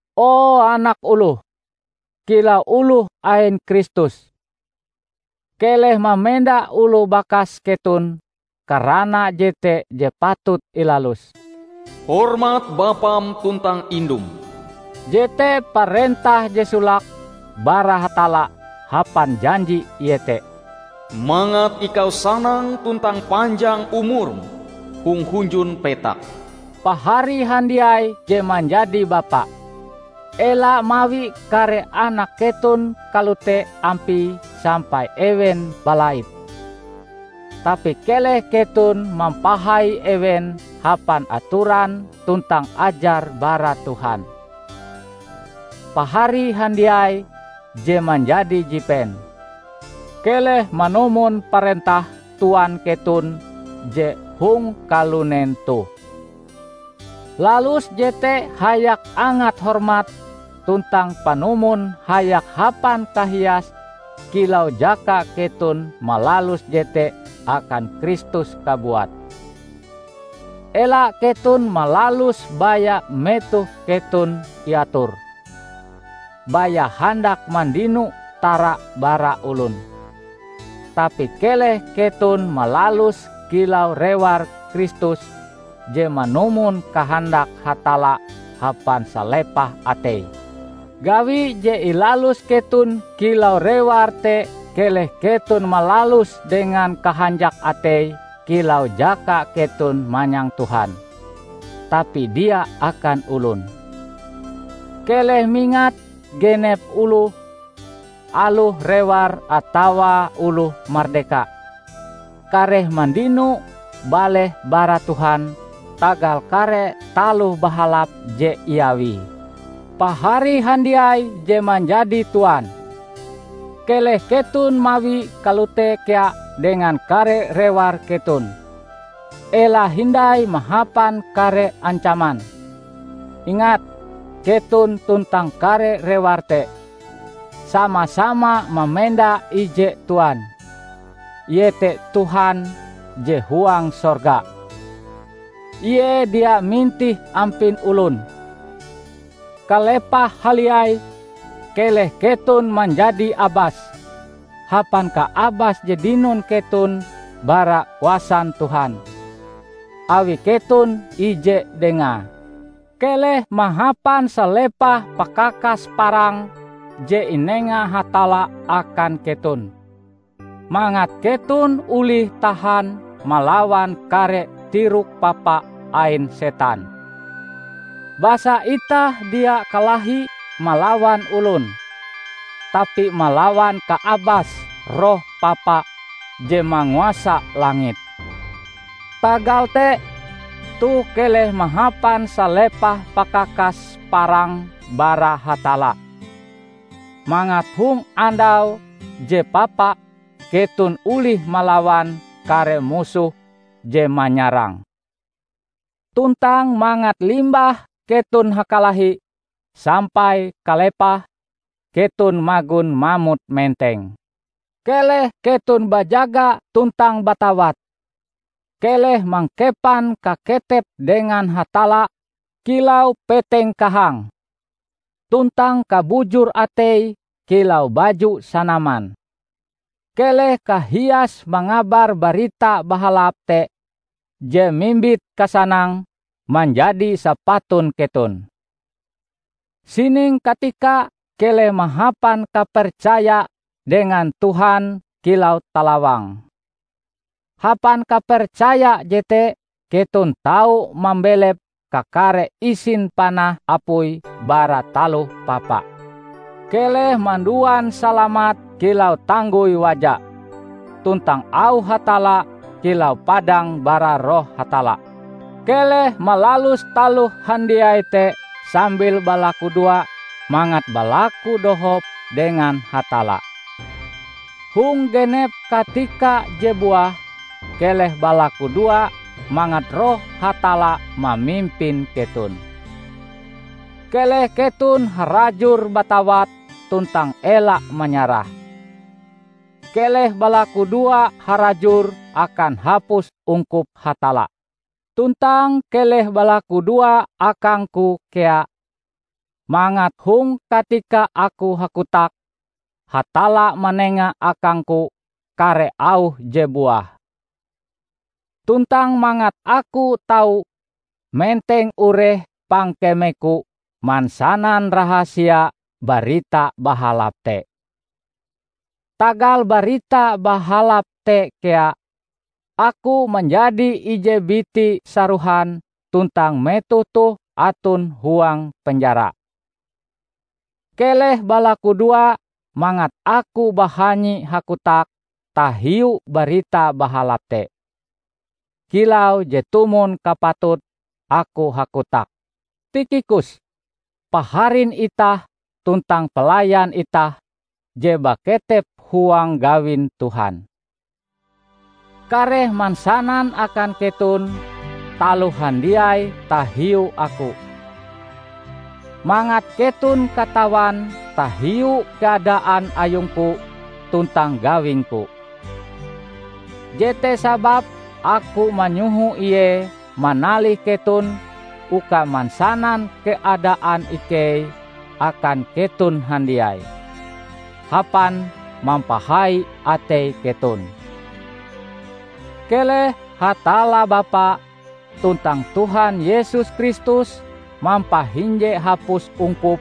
O anak oloh! Kilau oloh ain Kristus, keleh mamenda oloh bakas keton karana jete je patut ilalus. "Hormat bapam tuntang indum" jete parentah je solake bara Hatalla hapan janji, iete: "Mangat ikau sanang tuntang panjang umurm hong hunjun petak". Pahari handiai je manjadi bapa! Ela mawi kare anak keton kalote ampie sampai ewen balait. Tapi keleh keton mampahai ewen hapan atoran tuntang ajar bara Tuhan. Pahari handiai je manjadi jipen! Keleh manumon parentah tuan keton je hong kalunen toh. Lalus jete hayak angat hormat tuntang panumon hayak hapan kahias kilau jaka keton malalus jete akan Kristus kabuat. Ela keton malaluse baya metoh keton iator, baya handak mandino tara bara olon. Tapi keleh keton malaluse kilau rewar Kristus je manumon kahandak Hatalla hapan salepah atei. Gawi je ilalus keton kilau rewar te keleh keton malaluse dengan kahanjak atei kilau jaka keton manyang Tuhan, tapi dia akan olon. Keleh mingat, genep oloh, aloh rewar atawa oloh mardeka, kareh mandino baleh bara Tuhan tagal kare taloh bahalap je iawie. Pahari handiai je manjadi tuan! Keleh keton mawie kalote kea dengan kare rewar keton. Ela hindai mahapan kare ancaman. Ingat, keton tuntang kare rewar te, sama-sama mamenda ije tuan, iete Tuhan je huang sorga. Ie dia mintih ampin olon. Kalepahe haliai, keleh keton manjadi abas hapan kaabas je dinon keton bara kuasan Tuhan, awi keton ije Dengae. Keleh mahapan salepah pakakas parang je inenga Hatalla akan keton, mangat keton olih tahan malawan kare tirok papa ain setan. Basa itah dia kalahi malawan olon, tapi malawan kaabas roh papa je manguasa langit. Tagal te, toh keleh mahapan salepah pakakas parang bara Hatalla, mangat hong andau je papa keton olih malawan kare musoh je manyarang. Tuntang mangat limbah keton hakalahi sampai kalepahe keton magon mamot menteng. Keleh keton bajaga tuntang batawat. Keleh mangkepan kaketep dengan Hatalla kilau peteng kahang, tuntang kabujur atei kilau baju sanaman. Keleh kahias mangabar Barita Bahalap te je mimbit kasanang manjadi sapatun keton. Sining katika keleh mahapan kapercaya dengan Tuhan kilau talawang; hapan kapercaya jete keton tau mambelep kakare isin panah apui bara taloh papa. Keleh manduan salamat kilau tanggoi waja, tuntang auh Hatalla kilau padang bara Roh Hatalla. Keleh malalus taloh handiai te sambil balakudoa mangat balaku dohop dengan Hatalla. Hong genep katika je buah, keleh balakudoa mangat Roh Hatalla mamimpin keton. Keleh keton harajur batawat tuntang ela manyarah. Keleh balakudoa harajur akan hapus ungkup Hatalla. Tuntang keleh balakudoa akangku kea, mangat hong katika aku hakotak, Hatalla manenga akangku kare auh je buah. Tuntang mangat aku tau menteng ureh pangkemeku mansanan rahasia Barita Bahalap te. Tagal Barita Bahalap te kea, aku manjadi ije biti sarohan tuntang metoh toh aton huang penjara. Keleh balakudoa mangat aku bahanyi hakotak tahiu Barita Bahalap te, kilau je tumon kapatute aku hakotak. Tikhikus, paharin itah tuntang pelayan itah je baketep huang gawin Tuhan, kareh mansanan akan keton taloh handiai tahiu aku, mangat keton katawan tahiu keadaan ayungku tuntang gawingku. Jete sababe aku manyoho ie manalih keton uka mansanan keadaan ikei akan keton handiai, hapan mampahai atei keton. Keleh Hatalla Bapa, tuntang Tuhan Yesus Kristus mampahinje hapus ungkup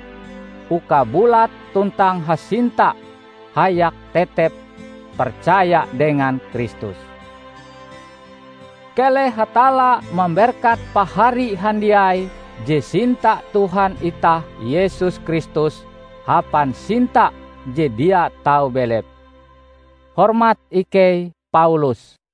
uka bulat tuntang hasinta hayak tetep percaya dengan Kristus. Keleh Hatalla mamberkat pahari handiai je sinta Tuhan itah Yesus Kristus hapan sinta je dia tau belep. Hormat ikei, Paulus